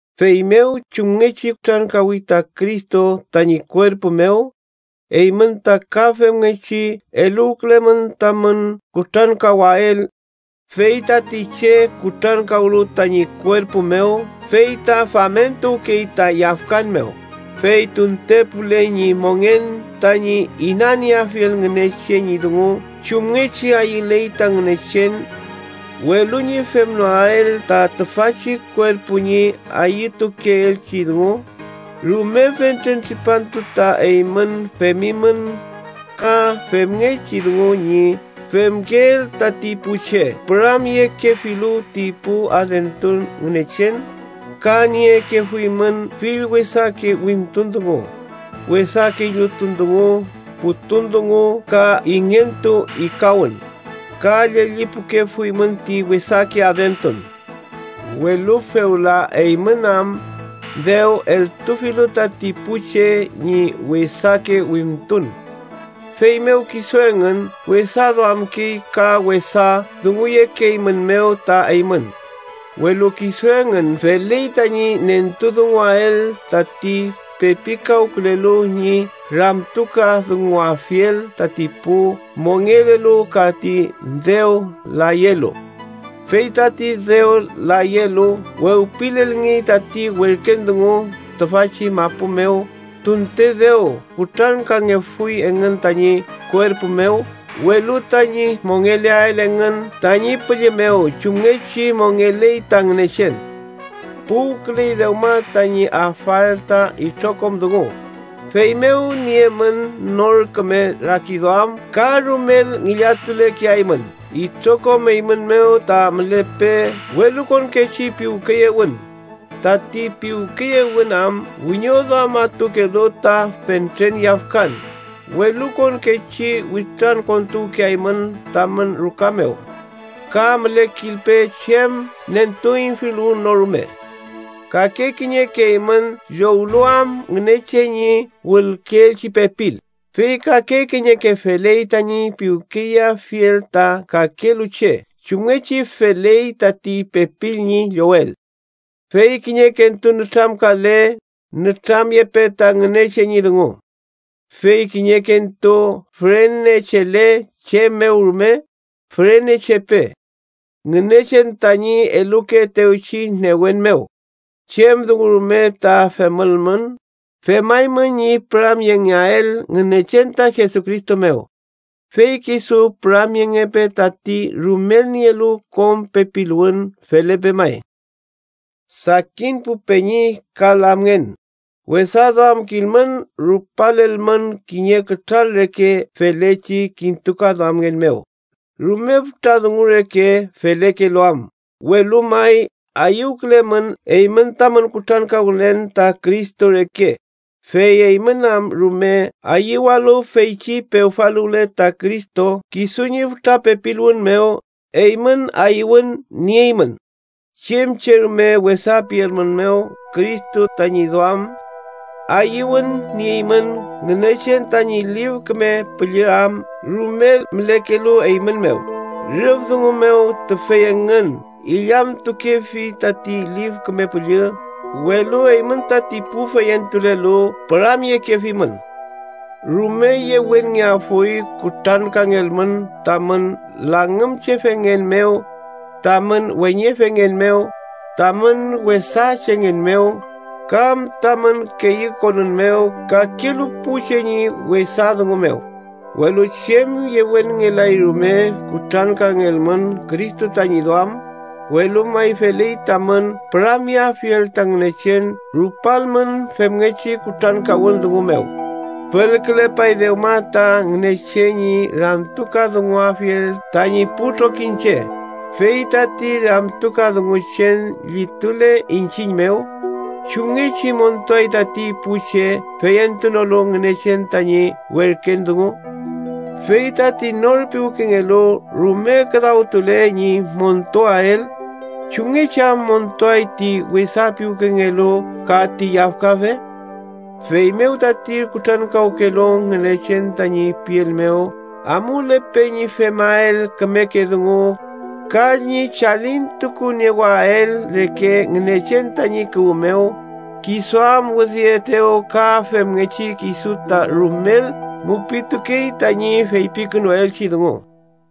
Feymew, chumngechi kutrankawi ta Cristo tañi kuerpu mew, eymün ta ka femngechi eluwkülemün tamün kutrankawael. Fey tati che kutrankawlu tañi kuerpu mew fey ta famentuwkey ta yafkan mew, fey tuntepule ñi mongen tañi inanieafiel Ngünechen ñi dungu chumngechi ayüley ta Ngünechen, welu ñi femnoael ta tüfachi kuerpu ñi ayütukeelchi dungu. Rume fentren tripantu ta eymün femimün ka femngechi dungu ñi femkeel tati pu che püramyekefilu ti pu adentun ngünechen, ka niekefuymün fill wesake wimtun dungu, wesake illutun dungu, putun dungu ka ingentu ikawün, ka llellipukefuymün ti wesake adentun. Welu fewla, eymün am dew eltufilu tati pu che ñi wesake wimtun, feymew kisu engün wesaduamkey ka wesa dunguyekeeymünmew ta eymün. Welu kisu engün feley tañi nentudunguael tati pepikawkülelu ñi ramtukadunguafiel tati pu mongelelu ka ti dew layelu. Fey tati dew layelu wewpilelngey tati werken dungu, tüfachi mapu mew tunte dew kutrankangefuy engün tañi kuerpu mew, welu tañi mongeleael engün tañi püllü mew chumngechi mongeley ta Ngünechen. Puwküley dewma tañi afael ta itrokom dungu. Feymew, niemün nor küme rakiduam ka rumel ngillatulekeaymün. Itrokom eymün mew ta mülepe welukonkechi piwkeyewün, tati piwkeyewün am wiñoduamatukelu ta fentren yafkan. Welukonkechi witrankontuwkeaymün tamün ruka mew, ka mülekilpe chem nentuüñfiluwün no rume. Kake kiñeke eymün llowlu am Ngünechen ñi wülkeelchi pepil, fey kake kiñeke feley tañi piwkeyeafiel ta kakelu che chumngechi feley tati pepil ñi llowel. Fey kiñekentu nütramkale, nütramyepe ta Ngünechen ñi dungu. Fey kiñekentu fürenechele chem mew rume, fürenechepe Ngünechen tañi elukeetewchi newen mew. Chem dungu rume ta femülmün, femaymün ñi püramyengeael Ngünechen ta Jesucristo mew. Fey kisu püramyengepe tati rumel nielu kom pepiluwün. Felepe may. Sakin pu peñi ka lamngen, wesaduamkilmün rupalelmün kiñe kütral reke felechi kintukaduamngen mew, rume fütra dungu reke felekelu am, welu may ayüwkülemün eymün tamün kutrankawkülen ta Cristo reke, fey eymün am rume ayüwalu feychi pewfaluwle ta Cristo kisu ñi fütra pepiluwün mew. Eymün ayüwün nieymün, chem che rume wesa pielmünmew Cristo tañi duam. Ayüwün nieymün Ngünechen tañi Lif Küme Püllü am rumel mülekelu eymün mew. Rüf dungu mew, tüfey engün illamtukefi tati Lif Küme Püllü, welu eymün tati pu feyentulelu püramyekefimün. Rume yewenngeafuy kutrankangelmün tamün langümchefengen mew, tamün weñefengen mew, tamün wesa chengen mew, kam tamün keyükonün mew kakelu pu che ñi wesa dungu mew. Welu chem yewenngelay rume kutrankangelmün Cristo tañi duam, welu may feley tamün püramyeafiel ta Ngünechen rupalmün femngechi kutrankawün dungu mew. Fülkülepay dewma ta Ngünechen ñi ramtukadunguafiel tañi pu trokiñche. Fey tati ramtukadunguchen llitule iñchiñ mew, ¿chumngechi montuay tati pu che feyentunolu Ngünechen tañi werken dungu? Fey “tati nor piwkengelu rume küdawtule ñi montuael, ¿chumngechi am montuay ti wesa piwkengelu ka ti yafkafe?” Feymew tati kutrankawkelu Ngünechen tañi piel mew, amulepe ñi femael kümeke dungu ka ñi chalintukuniewael reke Ngünechen tañi kuwü mew, kisu am widüetew, ka femngechi kisu ta rumel mupitukey tañi feypikünuelchi dungu.